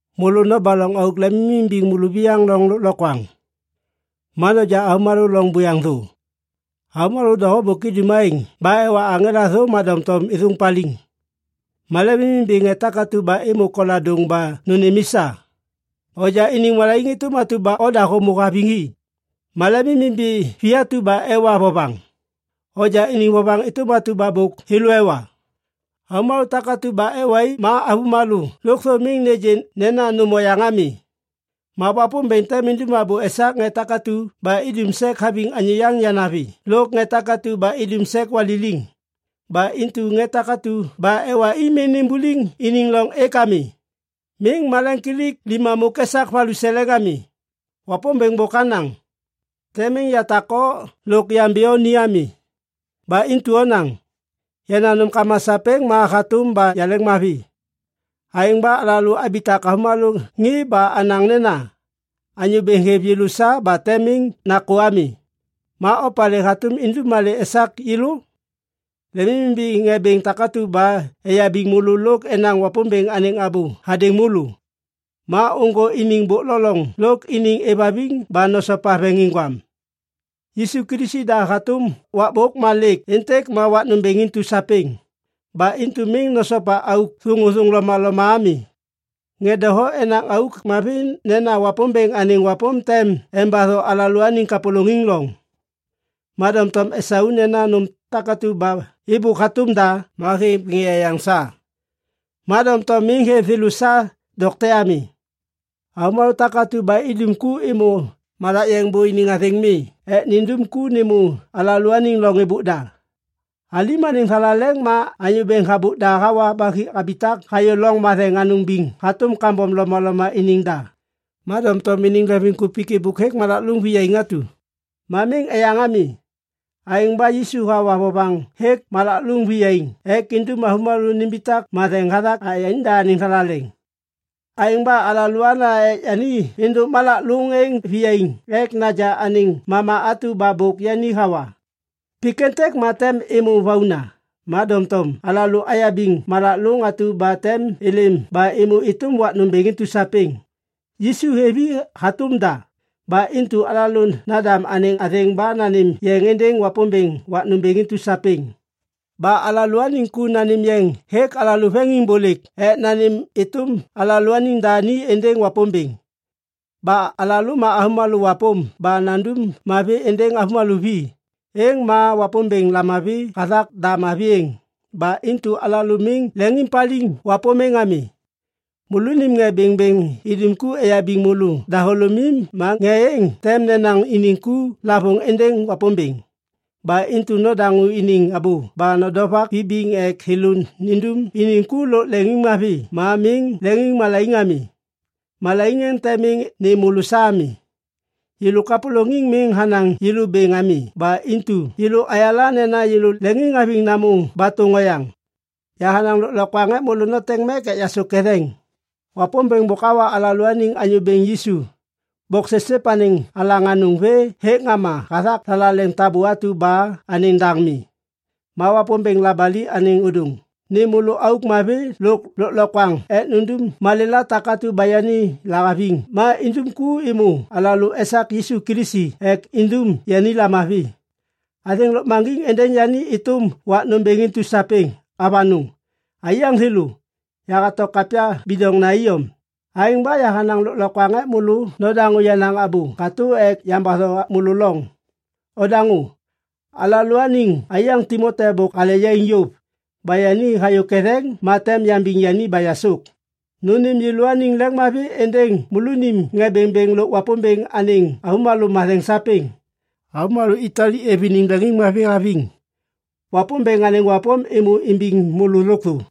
Môlô nobaloŋ auk lemimimbiŋ môlôviyaŋ loŋ lôklokwaŋ. Ma noja avômalô loŋ buyaŋ thô. Avômalô doho bôk idum aêŋ ba ewa aŋela thô ma doŋtom êthôŋ paliŋ. Ma lemimimbi ŋê takatu ba êmô koladôŋ ba nônêm i sa. Onja iniŋ malaiŋ êtôm atu ba oda hômô haviŋ i. Ma lemimimbi vi atu ba ewa vovaŋ. Onja iniŋ vovaŋ êtôm atu ba thêlô ewa. Avômalô takatu ba ewa i ma avômalô lôkthô miŋ nêgê nena nôm oyaŋ ami. Ma Wapômbêŋ tem indum abô esak ŋê takatu ba idum sek haviŋ anyô yaŋ yanavi lôk ŋê takatu ba idum sek waliliŋ. Ba intu ŋê takatu ba ewa i miŋ nimbuliŋ iniŋ loŋ êk ami. Miŋ malemkilik limamôk esak valuseleŋ ami. Wapômbêŋ bôk hanaŋ, “Tem miŋ yatak o lôk yambi o ni ami.” Ba intu onaŋ, “Yenaŋ nômkama sapêŋ ma hatôm ba yaleŋmavi”. Aêŋ ba alalô abitak avômalô ŋê ba anaŋ nena, “Anyô Bêŋ hêv yêlô sa ba tem miŋ nakô ami. Ma opalê hatôm indum malê esak yêlô?” Lemimimbi ŋê bêŋ takatu ba eyabiŋ môlô lôk enaŋ Wapômbêŋ anêŋ abô hadêŋ môlô. Ma ôŋgô iniŋ bôk lo loŋ lôk iniŋ êvhaviŋ ba nosopa veŋiŋgwam. Yisu Kilisi da hatôm wakbôk ma lêk êntêk ma wak nômbêŋ intu sapêŋ. Ba intu miŋ nosopa auk thôŋôthôŋ lomaloma ami. Ŋê doho enaŋ auk mavi nena Wapômbêŋ anêŋ wapôm tem embatho alalôaniŋ kapôlôŋiŋ loŋ. Ma doŋtom esau nena nôm takatu ba êbôk hatôm da ma hêv ŋê eyaŋ sa, ma doŋtom miŋ hêv thêlô sa dokte ami. Avômalô takatu ba idum ku êmô malak yeŋ bô iniŋ athêŋ mi ek nindum ku nêmô alalôaniŋ loŋ êbôk da. Alim anêŋ thalaleŋ ma anyô bêŋ habôk da hawa ba habitak hayô Loŋ Matheŋ Anôŋ Biŋ hatôm kambom lomaloma iniŋ da. Ma doŋtom iniŋ leŋviŋkupik êbôk hêk malak lôŋ viyaiŋ atu. Ma miŋ eyaŋ ami. Aêŋ ba Yisu hawa vovaŋ hêk malak lôŋ viyaiŋ ek indum avômalô nimbitak matheŋ hathak yanida anêŋ thalaleŋ. Aêŋ ba alôana ek yani êndôk malak lôŋ êŋ viyaiŋ ek naja anêŋ mama atu ba bôk yani hawa. Pik êntêk ma tem êmô vauna. Ma doŋtom alalô ayabiŋ malak lôŋ atu ba tem êlêm ba êmô êtôm wak nômbêŋ intu sapêŋ. Yisu hêv i hatôm da. Ba intu alalô nandam anêŋ athêŋ ba nanêm yeŋ êndêŋ Wapômbêŋ wak nômbêŋ intu sapêŋ. Ba alalôaniŋ ku nanêm yeŋ hêk alalô veŋiŋbôlêk ek nanêm êtôm alalôaniŋ da ni êndêŋ Wapômbêŋ. Ba alalô ma avômalô wapôm ba nandum mavi êndêŋ avômalô vi, êŋ ma Wapômbêŋ lamavi hathak da mavi êŋ. Ba intu alalô miŋ leŋiŋpaliŋ wapôm êŋ ami. Môlônim ŋê bêŋbêŋ idum ku eyabiŋ môlô dahôlômim ma ŋê êŋ tem nenaŋ iniŋ ku lavôŋ êndêŋ Wapômbêŋ. Ba intu nodaŋô iniŋ abô ba nodovak vibiŋ ek thêlô nindum iniŋ ku lôk leŋiŋmavi ma miŋ leŋiŋmalaiŋ ami. Malaiŋ êŋ tem miŋ nêm môlô sa ami. Yêlô kapôlôŋiŋ miŋ hanaŋ yêlô bêŋ ami ba intu yêlô ayala nena yêlô leŋiŋhaviŋ namô batôŋ oyaŋ. Yahanaŋ lôklokwaŋ ek môlô noteŋ mek ek yasôk ketheŋ. Wapômbêŋ bôk hawa alalôaniŋ Anyô Bêŋ Yisu, boksipsip anêŋ alaŋ anôŋ vê hêk ŋama hathak thalaleŋ tabô atu ba anêŋ daŋ mi. Ma Wapômbêŋ labali anêŋ ôdôŋ nêm môlô auk mavi lôk lôklokwaŋ ek nundum malêla takatu ba yani lahaviŋ ma indum ku êmô alalô esak Yisu Kilisi ek indum yani lamavi. Athêŋ lôkmaŋgiŋ êndêŋ yani êtôm wak nômbêŋ intu sapêŋ. Avanôŋ. Aiyaŋ thêlô, yahato kapya bidoŋna iyom. Aêŋ ba yahanaŋ lôklokwaŋ ek môlô nodaŋô yenaŋ abô katô ek yambatho môlô loŋ. Odaŋô! Alalôaniŋ aiyaŋ Timoti bôk hale yaiŋ yôv. Ba yani hayô ketheŋ ma tem yambiŋ yani ba yasôk. Nônêm yêlôaniŋ leŋiŋmavi êndêŋ môlônim ŋê bêŋbêŋ lôk Wapômbêŋ anêŋ avômalô matheŋ sapêŋ. Avômalô Itali êv iniŋ leŋiŋmavi haviŋ. Wapômbêŋ anêŋ wapôm êmô imbiŋ môlô lôkthô.